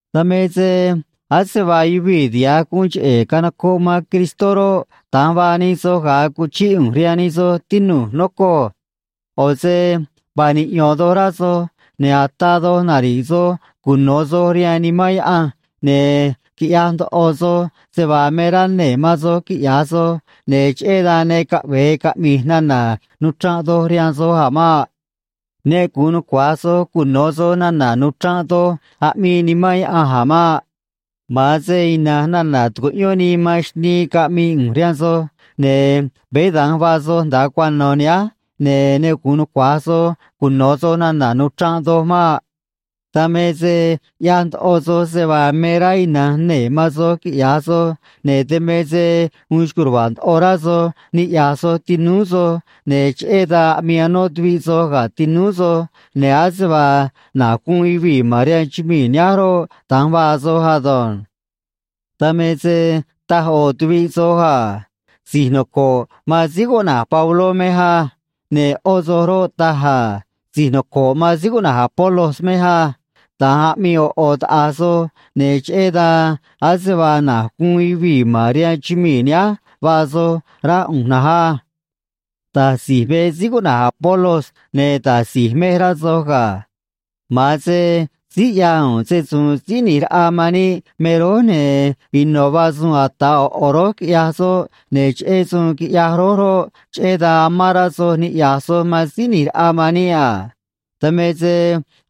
Dan me se ase vaa yuvii̱ tiha̱j guun cheꞌe̱ canocoꞌ man Cristó roꞌ, da̱nj vaa nij soj ga̱a cuchíꞌ ꞌu̱nj rihaan nij soj, tinu̱j, nocoj. ꞌO̱ se vaa niꞌyo̱n doj rá soj, ne̱ ataa doj nari̱ꞌ soj cuno̱ soj rihaan Nimán Yaꞌanj, ne̱ quiꞌyaj ndoꞌo soj se vaa me rá nee̱ man soj quiꞌya̱j soj, ne̱ cheꞌé dan ne caꞌve̱e caꞌmi̱j nana̱ nuchranꞌ doj rihaan soj a̱ maꞌ. Ne gu̱un nucua̱j soj cuno̱ soj nana̱ nuchranꞌ doj aꞌmii Nimán Yaꞌanj a̱ maꞌ. Ma̱an se ina̱nj nana̱ tucuꞌyón nii man xnii caꞌmii ꞌu̱nj rihaan soj, ne̱ veé da̱nj vaa soj nda̱a cuano̱ nihánj, ne̱ ne gu̱un nucua̱j soj cuno̱ soj nana̱ nuchranꞌ doj maꞌ. Dan me se ꞌyaj ndoꞌo soj se vaa me rá ina̱nj nee̱ man soj quiꞌya̱j soj, ne̱ dan me se uun xco̱j ruva̱a̱ ndoꞌo rá soj niꞌya̱j soj tinúú soj, ne̱ cheꞌé dan aꞌmii anó tuviꞌ soj ga̱ tinúú soj, ne̱ ase vaa na̱j guun yuvii̱ ma̱n rihaan chumii̱ nihánj roꞌ, da̱nj vaa soj ado̱nj. Dan me se taj ꞌo̱ tuviꞌ soj a: “Si̱j noco̱ꞌ man síí cuꞌna̱j Pabló mej á.” Ne̱ ꞌó soꞌ roꞌ, taj a: “Si̱j noco̱ꞌ man síí cuꞌna̱j Apolos mej á.” Da̱nj aꞌmii ꞌo̱ ꞌo̱ taꞌa̱j soj, ne̱ cheꞌé dan ase vaa na̱j guun yuvii̱ ma̱n rihaan chumii̱ nihánj vaa soj, rá ꞌu̱nj na̱nj á. Da̱j si̱j me síí cuꞌna̱j Apolos, ne̱ da̱j si̱j mej, rá soj ga̱. Ma̱an se síí ꞌyaj u̱u̱n se‑su̱u̱n Síí ꞌNi̱j Raꞌa man níꞌ me rój, ne̱ ino̱ vaa suun ata̱ ꞌo̱ ꞌo̱ rój, quiꞌyaj soꞌ, ne̱ cheꞌé suun quiꞌyaj rój roꞌ, cheꞌé dan amán rá soj niꞌya̱j soj man Síí ꞌNi̱j Raꞌa man níꞌ a. Dan me se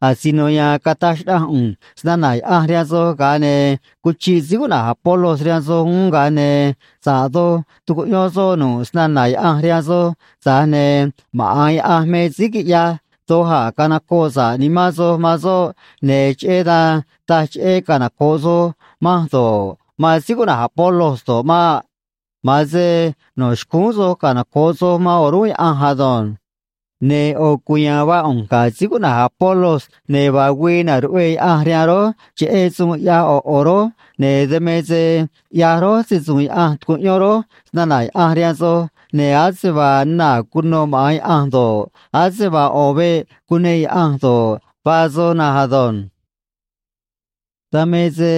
asino ya̱a̱n cataj xnaꞌanj ꞌu̱nj snana̱ Yaꞌanj rihaan soj, ga̱a ne̱ cuchiꞌ síí cuꞌna̱j Apolos rihaan soj uún, ga̱a ne̱ sa̱ꞌ doj tucuꞌyón soꞌ nu̱ꞌ snana̱ Yaꞌanj rihaan soj, tza̱j ne̱ maꞌa̱n Yaꞌanj me síí quiꞌyaj doj a̱ canocoꞌ sa̱ꞌ nimán soj man soꞌ, ne̱ cheꞌé dan taj cheꞌé canoco̱ꞌ soj manj do̱ꞌ, man síí cuꞌna̱j Apolos do̱ꞌ maꞌ. Ma̱an se no̱ xcúún soj canoco̱ꞌ soj man o̱rúnꞌ Yaꞌanj ado̱nj. Ne̱ ꞌo̱ cuya̱a̱n vaa ꞌu̱nj ga̱ síí cuꞌna̱j Apolos, ne̱ vaa güii na̱ruꞌvee Yaꞌanj rihaan rój cheꞌé suun ꞌyaj ꞌo̱ ꞌo̱ rój, ne̱ dan me se ꞌyaj rój se‑su̱u̱n Yaꞌanj, tucuꞌyón rój snana̱ Yaꞌanj rihaan soj, ne̱ ase vaa naa̱ cunô maꞌa̱n Yaꞌanj do̱ꞌ, ase vaa ꞌo̱ veꞌ cuneꞌ Yaꞌanj do̱ꞌ, vaa soj na̱nj ado̱nj. Dan me se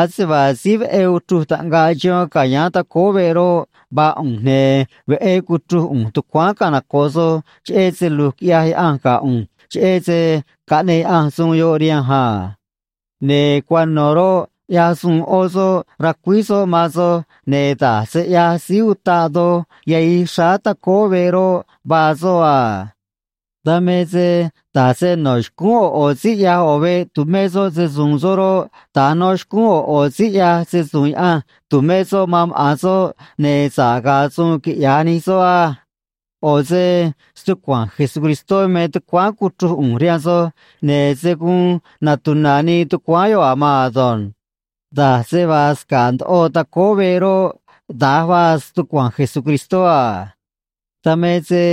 ase vaa síí veꞌé uchruj taꞌngaꞌ chihón ca̱yáán tacóó veꞌ roꞌ, vaa ꞌu̱nj, ne̱ veꞌé cuchruj ꞌu̱nj tucuáán canocoꞌ soj, cheꞌé se lu̱j quiꞌyaj Yaꞌanj ga̱ ꞌu̱nj, cheꞌé se caꞌneꞌ Yaꞌanj suun yoꞌ rihanj a. Ne̱ cuano̱ roꞌ, ꞌyaj suun ꞌó soꞌ racuíj soꞌ man soj, ne̱ da̱j se ꞌyaj síí utaꞌ doj yahij xráá tacóó veꞌ roꞌ, vaa soꞌ a. Dan me se, da̱j se no̱ xcúún ꞌo̱ ꞌo̱ síí ꞌyaj ꞌo̱ veꞌ tu̱mé soꞌ se‑su̱u̱n soꞌ roꞌ, da̱nj no̱ xcúún ꞌo̱ ꞌo̱ síí ꞌyaj se‑su̱u̱n Yaꞌanj tu̱mé soꞌ man maꞌa̱n soꞌ, ne̱ sa̱ꞌ ga̱a̱ suun quiꞌya̱j nij soꞌ á. ꞌO̱ se stucua̱nj Jesucristó me tucuáán cuchruj ꞌu̱nj rihaan soj, ne̱ se̱ guun natuna̱ nii tucuáán yoꞌ a̱ maan ado̱nj. Da̱j se vaa sca̱ꞌ ndoꞌo tacóó veꞌ roꞌ, da̱j vaa stucua̱nj Jesucristó a. Dan me se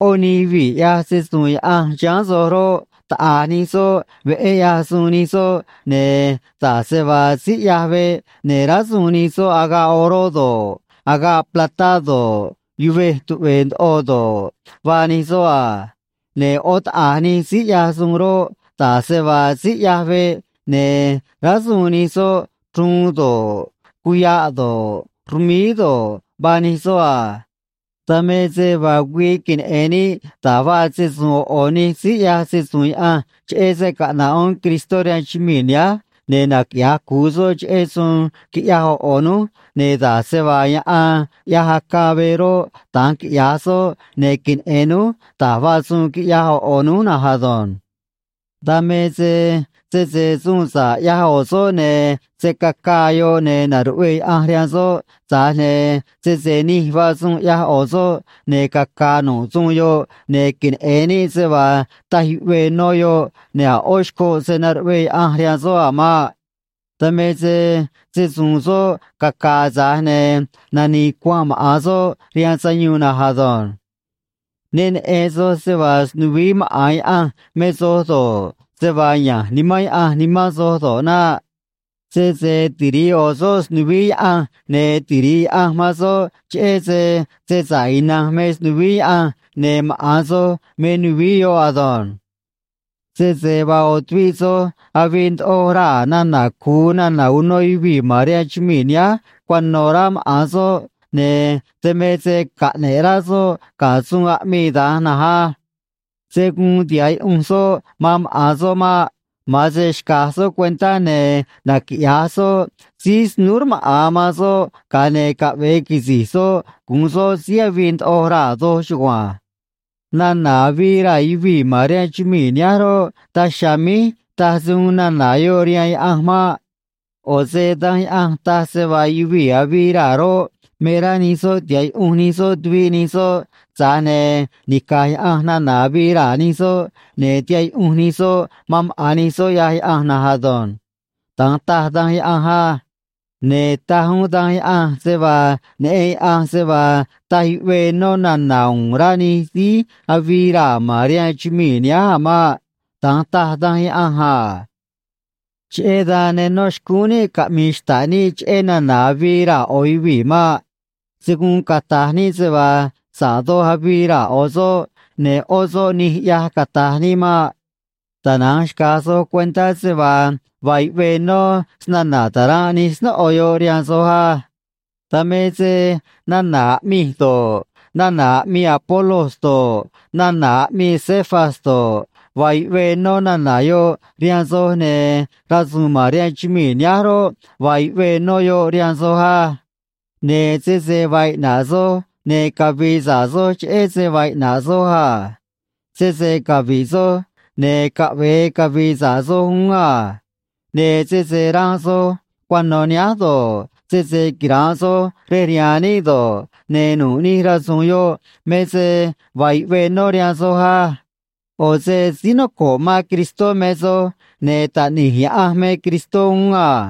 ꞌó nij yuvii̱ ꞌyaj se‑su̱u̱n Yaꞌanj chiháán soj roꞌ, taꞌa̱j nij soꞌ veꞌé ꞌyaj suun nij soꞌ, ne̱ da̱j se vaa síí ꞌyaj veꞌ ne̱ rásuun nij soꞌ agaꞌ oró do̱ꞌ, agaꞌ platá do̱ꞌ, yuvej tuꞌve̱e̱ ndoꞌo do̱ꞌ, vaa nij soꞌ a. Ne̱ ꞌó taꞌa̱j nij síí ꞌyaj suun roꞌ, da̱j se vaa síí ꞌyaj veꞌ ne̱ rásuun nij soꞌ chruun do̱ꞌ, cuya̱ꞌ do̱ꞌ, rmíí do̱ꞌ, vaa nij soꞌ a. Dan me se vaa güii queneꞌe̱n níꞌ da̱j vaa se‑su̱u̱n ꞌo̱ ꞌo̱ nij síí ꞌyaj se‑su̱u̱n Yaꞌanj, cheꞌé se caꞌna̱ꞌ uún Cristó rihaan chumii̱ nihánj, ne̱ naquiꞌya̱j cu̱u soꞌ cheꞌé suun quiꞌyaj ꞌo̱ ꞌo̱ núj, ne̱ da̱j se vaa yaꞌan ꞌyaj acaa veꞌ roꞌ, da̱nj quiꞌya̱j soꞌ, ne̱ queneꞌe̱n núj da̱j vaa suun quiꞌyaj ꞌo̱ ꞌo̱ núj na̱nj ado̱nj. Dan me se sese suun sa̱ꞌ ꞌyaj ꞌo̱ soꞌ, ne̱ se̱ cacaa yoꞌ, ne̱ na̱ruꞌvee Yaꞌanj rihaan soꞌ, tza̱j ne̱ sese nij vaa suun ꞌyaj ꞌo̱ soꞌ, ne̱ caca̱a̱ nu̱ꞌ suun yoꞌ, ne̱ queneꞌe̱n níꞌ se vaa taj yuꞌvee nó yoꞌ, ne̱ a̱ ꞌó xcoꞌ se̱ naruꞌvee Yaꞌanj rihaan soꞌ a̱ maꞌ. Dan me se se‑su̱u̱n soꞌ caca̱a̱, tza̱j ne̱ nani̱i̱ cuanꞌ maꞌa̱n soꞌ rihaan sayuun na̱nj ado̱nj. Ne neꞌen soj se vaa snuvií maꞌa̱n Yaꞌanj me soj do̱ꞌ, se vaa ya̱nj Nimán Yaꞌanj nimán soj do̱ꞌ naꞌ. Sese tiri̱ꞌ ꞌo̱ soꞌ snuvií Yaꞌanj, ne̱ tiri̱ꞌ Yaꞌanj man soꞌ, cheꞌé se se sa̱ꞌ ina̱nj me snuvií Yaꞌanj, ne̱ maꞌa̱n soj me nuvií yoꞌ ado̱nj. Sese vaa ꞌo̱ tuviꞌ soj avii ndoꞌo raa̱ nana̱ cu̱u nana̱ uno yuvii̱ ma̱n rihaan chumii̱ nihánj cuano̱, rá maꞌa̱n soꞌ, ne̱ dan me se caꞌne̱ꞌ rá soꞌ ga̱ suun aꞌmii da̱nj na̱nj á. Se̱ guun tiha̱ꞌ yuꞌunj soꞌ man maꞌa̱n soꞌ maꞌ. Ma̱an se xca̱j soꞌ cuentá ne̱ naquiꞌya̱j soꞌ síí snúú rmaꞌa̱n man soꞌ, ga̱a ne̱ caꞌve̱e quisi̱j soꞌ gu̱un soꞌ síí avii ndoꞌo raa̱ doj chugua̱nj. Nana̱ avii raa̱ yuvii̱ ma̱n rihaan chumii̱ nihánj roꞌ, daj chiha̱a̱ míj taj se uun nana̱ yoꞌ rihaan Yaꞌanj maꞌ. ꞌO̱ se Danj Yaꞌanj taj se vaa yuvii̱ avii raa̱ roꞌ, me rá nij soꞌ tiha̱ꞌ yuꞌunj nij soꞌ tuviꞌ nij soꞌ, tza̱j ne̱ nica̱j Yaꞌanj nana̱ avii raa̱ nij soꞌ, ne̱ tiha̱ꞌ yuꞌunj nij soꞌ man maꞌa̱n nij soꞌ ꞌyaj Yaꞌanj na̱nj ado̱nj. Da̱nj taj Danj Yaꞌanj á. Ne̱ taj uún Danj Yaꞌanj se vaa neꞌen Yaꞌanj se vaa taj yuꞌvee nó nana̱ uun rá nij síí avii raa̱ ma̱n rihaan chumii̱ nihánj a̱ maꞌ. Da̱nj taj Danj Yaꞌanj a. Cheꞌé dan ne nó xcúún níꞌ caꞌmi̱i̱ xta̱ꞌ níꞌ cheꞌé nana̱ avii raa̱ ꞌo̱ yuvii̱ maꞌ. Se̱ guun cata̱j níꞌ se vaa sa̱ꞌ doj avii raa̱ ꞌo̱ soꞌ, ne̱ ꞌó soꞌ nij ꞌyaj, cata̱j níꞌ maꞌ. Tana̱nj xca̱j soj cuentá se vaa vaa yuꞌvee nó snana̱ ta̱ranꞌ nij snóꞌo yoꞌ rihaan soj á. Dan me se nana̱ aꞌmij do̱ꞌ, nana̱ aꞌmii Apolos do̱ꞌ, nana̱ aꞌmii Cefas do̱ꞌ, vaa yuꞌvee nó nana̱ yoꞌ rihaan soj, ne̱ rasu̱u̱n ma̱n rihaan chumii̱ nihánj roꞌ, vaa yuꞌvee nó yoꞌ rihaan soj á. Ne̱ sese vaa iꞌna̱ꞌ soj, ne̱ cavi̱i̱ sa̱ꞌ soj, cheꞌé se vaa iꞌna̱ꞌ soj a. Sese cavi̱ꞌ soj, ne̱ caꞌve̱e cavi̱i̱ sa̱ꞌ soj uún a. Ne̱ sese ranꞌ soj cuano̱ nihánj do̱ꞌ, sese quira̱nꞌ soj rej rihaan níꞌ do̱ꞌ, ne̱ nu̱ꞌ nij rasu̱u̱n yoꞌ me se vaa yuꞌvee nó rihaan soj á. ꞌO̱ se síí noco̱ꞌ man Cristó me soj, ne̱ Taꞌni̱j Yaꞌanj me Cristó uún a.